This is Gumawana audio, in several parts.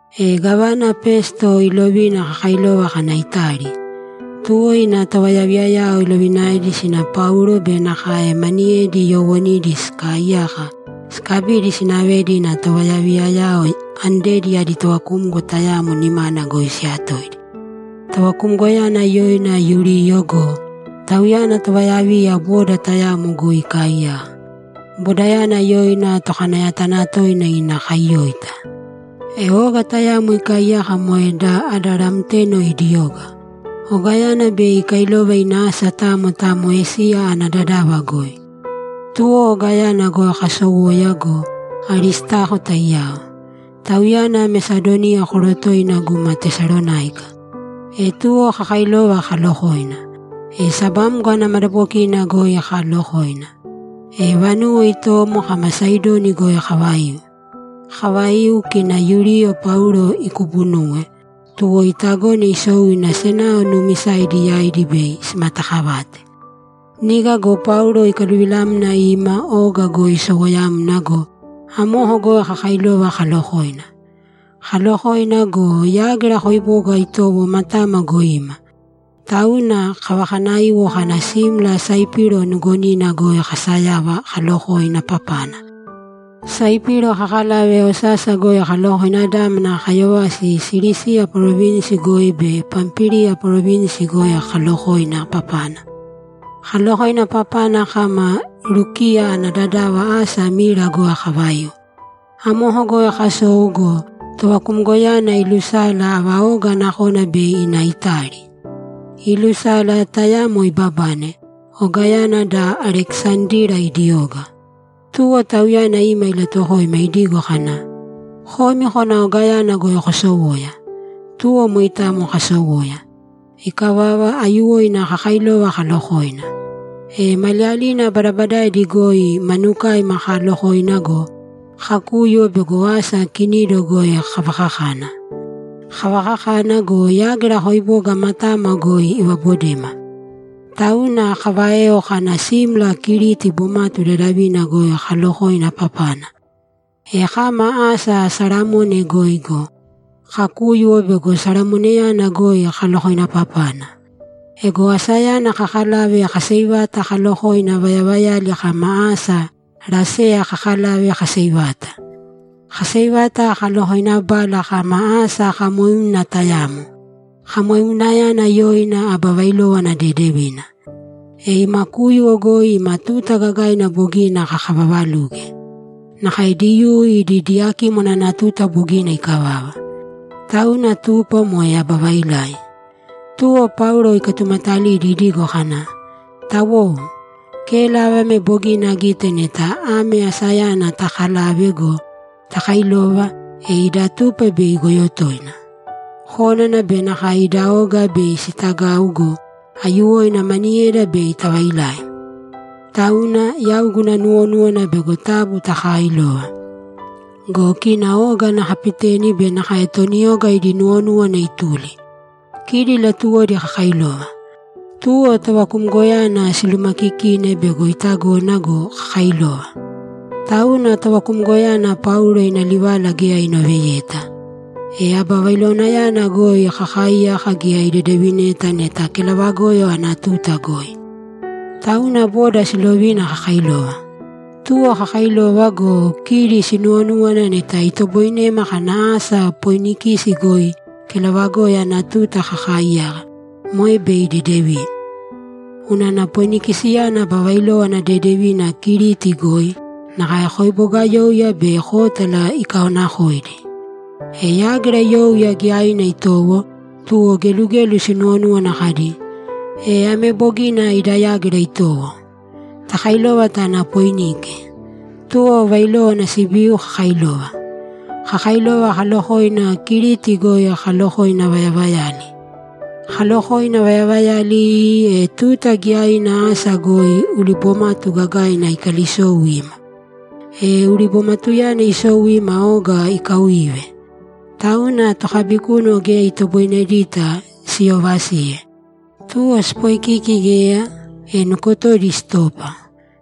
E gávana Pesto ilovina kakailova kana Itali. Tuwo ina tovayaviyayao ilovinaedi sina Paulo be nakae maniyedi yoowonidi sikaaiyaka, sikabidi sinavedi ina tovayaviyayao andedi adi tovakumgo tayamo nimana goi siyatoidi. Tovakumgoyana yoina Yuliyo go, tauyana tovayaviya boda tayamo goi ikaaiyaka, bodayana yoina Tokanayatanatoina ina kaiyóita. E oga tayamo ikaaiyaka moe da Adaramteno idi oga. Ogayana bei ikailova ina asa tamo tamo Esiya ana dadava goi. Tuwo ogayana goi kasowoya go, Aristako taiyao. Tauyana Mesadoniya korotoina guma Tesalonáika. E tuwo kakailova kalokoina. E sabamgo ana madabokina goi kaalokoina. E vanuwo itomo kama Saidoni goi kavaiu. Kavaiu, kina Yuliyo Paulo ikubunuwe, tuwo itagone isou ina senao nuumisaidi yaidi bei simatakavate. Niga go Paulo ikaluvilamna ima oga goi isowoyamna go, amoko goi kakailova kalokoina. Kaalokoina go, yágira koiboga itowo matama goi ima, tauna kavakanaiwo kana simla Saipiro nugonina goi kasayava kalokoina papana. Saipiro kakalave osasa goi kalokoina dámana kayovasi Silisiya parovinsi goi be Pampíliya parovinsi goi kalokoina papana. Kalokoina papana kama Lukiya ana dadava asa Mira goi kavaiu. Amoko goi kasou go, tovakumgoyana ilusala ava oga nakona bei ina Itali. Iilusala, tayamo ibabane, ogayana da Alekisandira idi oga. Tuwo tauyana ima ilatuwokoima idigo kana, ‘Komi kōna ogayana goi kosowōya.’ Tuwo moitamo kasowoya. Ikavava, aiyuwoina kakailova kalokoina. E maliyalina badabadaidi goi manukaima kaalokoina go, kakúyuwo bego asa Kinido goi kavakakana. Kavakakana go, yágira koiboga matama goi ivabodema. Tauna kaváeo kana simla Kiriti bomatu dadavina goi kalokoina papana. E kama asa Salamone goi go, kakúyuwo bego Salamoneyana goi kalokoina papana. Ego asayana kakalave kaseivata kalokoina vayavayali kama asa Laseya kakalave kaseivata. Kaseivata kalokoinabala kama asa kamoiuna tayamo. Kamoiunayana yoina Aba Vailówana Dedevina. E ima kúyuwo goi ima tuta gagaina bogina kakavavaluge. Nakae Diyuu idi Diyakímwana ana tuta bogina ikavava. Tauna tupa moe aba vailai. Tuwo Paulo ikatumatalidi idigo kana, ‘Tawou, kélava ame bogina agite neta ame asayana takalave go, takailova, e ida tupa bei igoyo toina. Kónana be nakae ida oga bei sitagau go, aiyuwoina maniyeda bei tavailai. Tauna, yau guna nuwonúwana bego taabu taakailōva.’ Go kina oga ana kapiteni be nakae toni oga idi nuwonúwana ituli. Kidi latuwodi kakailova. Tuwo tovakumgoyana silumakikine bego itagona go, kakailova. Tauna tovakumgoyana Paulo ina livala geya inoveyeta. E aba vailowanayana goi kakaaiyaka geya idedevineta neta kelavagoyo ana tuta goi. Tauna boda silovina kakailova. Tuwo kakailova go, kidi sinuwonúwana neta itoboinema kana asa Poinikisi goi kelavagoyo ana tuta kakaiyaka, moe bei dedevina. Unana Poinikisiyana aba vailówana dedevina Kiriti goi, nakae koibogayouya be kótala ikaonakoidi. E yágira youya giyaina itowo, tuwo gelugelu sinuwonúwana kadi, ‘E ame bogina ida yágira itowo. Takailōva tāna Poinike.’ Tuwo vailówana sibiu kakailova. Kakailova kalokoina, Kiriti goi kalokoina vayavayali. Kalokoina vayavayali iii, e tuta giyaina asa goi ulibomatu gagaina ikalisou ima. E ulibomatuyana isou ima oga ikauive. Tauna tokabikúnuwo geya itoboinedita siyovasiye. Tuwo sipoikiki geya, e nukotodi sitopa.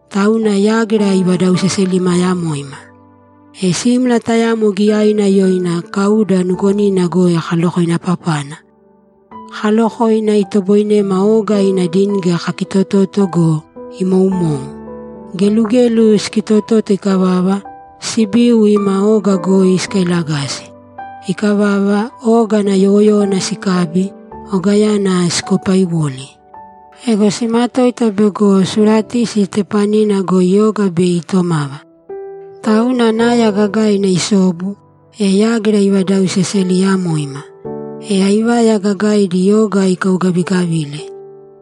Tauna yágira ivadauseseliyamoima. E simla tayamo giyaina yoina Kauda nugonina goi kalokoina papana. Kaalokoina, itoboinema oga ina dingi kakitototo go, imoumou. Gelugelu sikitototo ikavava, sibiu ima oga goi sikailagasi. Ikavava, oga ana yowoyówana sikabi, ogayana sikopaiwoli. Ego simatoita bego Suratisi tepanina goi oga bei itomava. Tauna naya gagaina isobu, e yágira ivadauseseliyamoima. E aivaya gagaidi, oga ikaugavigavile.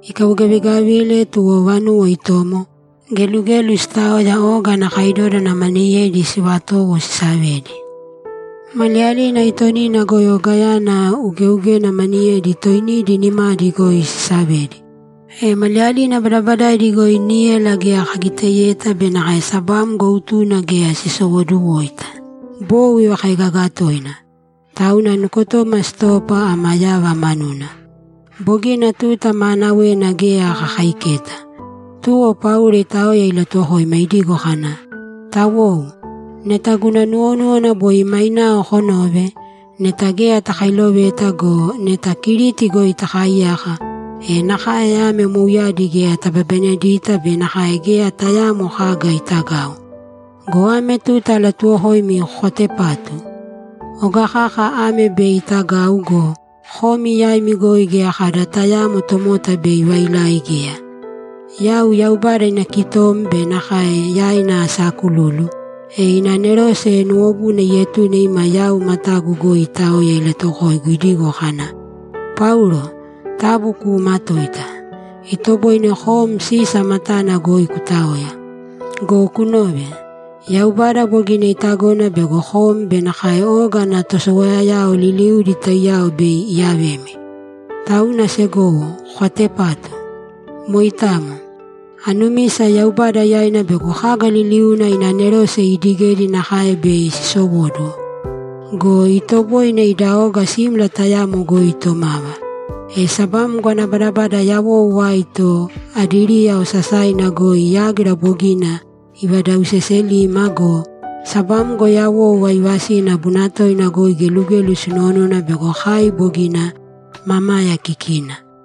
Ikaugavigavile, tuwo vanuwo itomo, gelugelu sitaoya oga ana kaidoda maniyedi sivatowo sisavedi. Maliyalina aitonina goi ogayana ugeugena maniyedi toinidi nimadi goi sisavedi. E maliyalina badabadaidi goi níyala geya kagiteyeta be nakae sabamgo utuna geya sisowoduwoita. Bou ivakaigaga toina. Tauna nukotoma sitopa ama yava manuna. Bogina tuta maanawena geya kakaiketa. Tuwo Paulo itaoya ilatuwokoima idigo kana, ‘Tawou, neta guna nuwonúwana boi mainao konove! Neta geya takailoveta go, neta Kiriti goi takaiyaka, e nakae ame mouyadi geya tababanedita be nakae geya tayaamo kaga itagau. Go ame tuta alatuwokoimi kokatepātu! Oga kaka ame bei itagau go, komi yaimi goi geya kada tayaamo tomota bei ivailai geya. Yau Yaubada ina kitom be nakae yaina asaakululu, e ina anerose nuwobuna ietune ima yau matagu goi itaoya ilatuwokoigu idigo kana, “Paulo, taabu kuumatōita! Itoboine kom Sisa matana goi kutaoya. Go kunōve! Yaubada bogina itagona bego kom be nakae oga ana tosowoyayao liliudi taiyao bei iyavemi.” Tauna segowo, kokatepātu! Moitamo. Anumisa Yaubada yaina bego kaga liliuna ina anerose iidigedi nakae bei sisowóduwo. Go itoboine ida oga simla tayamo goi itomava.’ E sabamgo ana badabada yawou aito Adiriya osasaina goi yágira bogina ivadauseselima go, sabamgo yawou aivasina bunatoina goi gelugelu sinuwonúwana bego kai bogina mamaya kikina.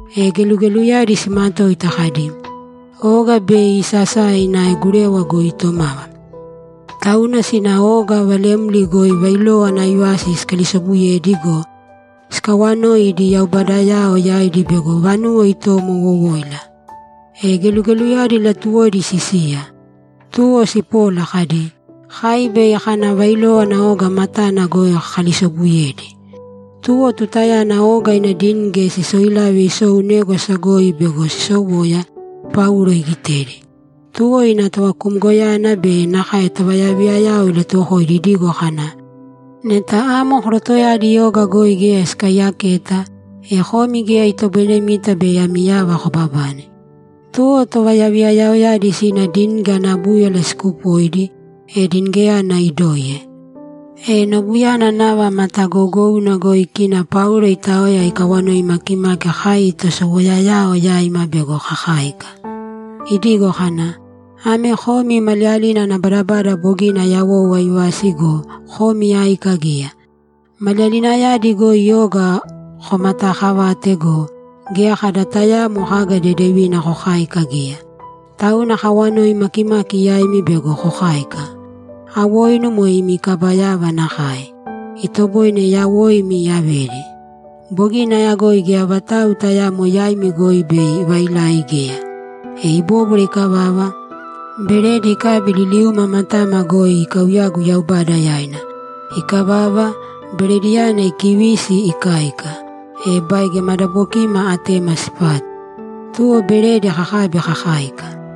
E gelugeluyadi simatoita kadi, ‘Oga bei isasae ina gurewa goi itomava.’ Tauna sina oga valemli goi vailówana aivasi sikalisobuyedi go, sikawanoi idi yaubadayao yaidi bego vanuwo itomo wowóila. E gelugeluyadi latuwodi sisiya. Tuwo sipola kadi, ‘Kai bei kana vailówana oga matana goi kakalisobuyedi.’ Tuwo tutayana oga ina dingi sisoilave isou négwasa goi bego sisowoya, Paulo igitedi. Tuwo ina tovakumgoyana be nakae tovayaviyayao ilatuwokoidi idigo kana, ‘Neta amo korotoyadi oga goi geya sikaiyaketa, e komi geya itoboinemita bei ami yava kobabane.’ Tuwo tovayaviyayaoyadi sina dingi ana búyala sikupoidi, e dingiyana idoiye. E nobuyana nava matagougouna goi kina Paulo itaoya ikawanoi makimaki kai tosowoyayao yaima bego kakáika, idigo kana, ‘Ame komi maliyalina ana badabada bogina yawou aivasi go, komi áika geya. Maliyalinayadi goi oga komataakavate go, geya kada tayaamo kaga dedevina kokáika geya. Tauna akawanoi makimaki yaimi bego kokáika. Awoinu moe imi kaba yava nakae; itoboine yawoimi iyavedi. Bogina ayagoi geya vatau tayaamo yaimi goi bei ivailai geya.’ E ibóbwara ikavava, beredi ikabi liliuma matama goi ikauyagu Yaubada yaina. Ikavava, berediyana ikivisi ikáika, e baige madabokima atema sipatu. Tuwo beredi kakabi kakáika.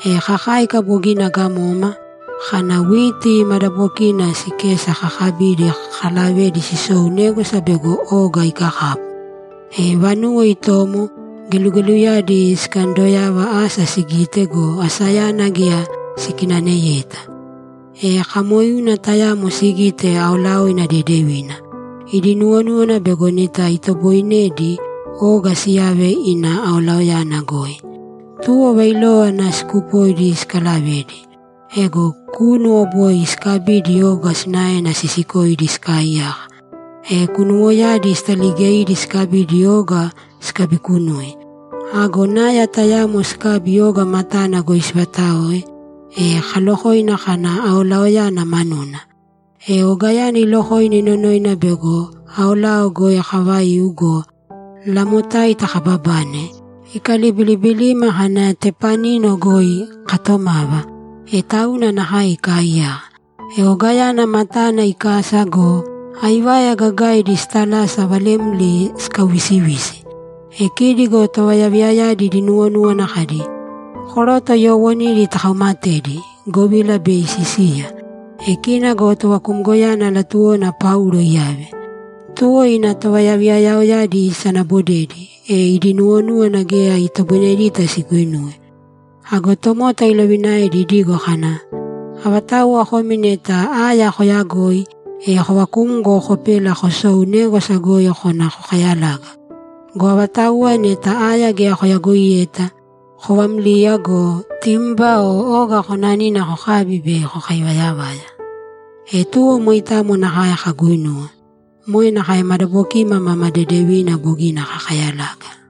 E kakáika bogina gamoma, kana witi madabokina sikesa kakabidi kalavedi sisou négwasa bego oga ikakapu. E vanuwo itomo, gelugeluyadi sikandoyava asa sigite go, asayana geya sikinaneyeta. E kamoiuna tayamo sigite aolaoina dedevina. Idi nuwonúwana bego neta itoboinedi, oga siyave ina aolaoyana goi. Tuwo vailówana sikupoidi sikalavedi. Ego kúnuwo boi sikabidi oga sinaena sisikoidi sikaaiyaka. E kunuwoyadi sitaligeidi sikabidi oga sikabikunui. Ago naya tayamo sikabi oga matana goi sivataoe, e kalokoina kana aolaoyana manuna. E ogayana ilokoina inonoina bego aolao goi kavaiu go, lamotaita kababane, ikalibilibilima kana tepanina goi katomava, e tauna nakae ikaaiyaka. E ogayana matana ikasa go, aivaya gagaidi sitalasa valemli sikauvisivisi. E kidi go tovayaviyayadi idi nuwonúwana kadi, ‘Koroto yoowonidi takaumatedi, govila bei sisiya.’ E kina go tovakumgoyana latuwona Paulo iyave. Tuwo ina tovayaviyayaoyadi isanabodedi, e idi nuwonúwana geya itoboinedita siguinuwe. Ago tomota ilovinaedi idigo kana, ‘Avatauwa komi neta aya koyagoi, e kovakūmgo kopēla kosōu négwasa goi kōna kokayalāga. Go avatauwa neta aya geya koyagoiyeta, kovāmliya go, timba o oga konanina kokābi bei kokaivayavaya.’ E tuwo moitamo nakae kaguinuwe. Moe nakae madabokiima mama dedevina bogina kakayalaga.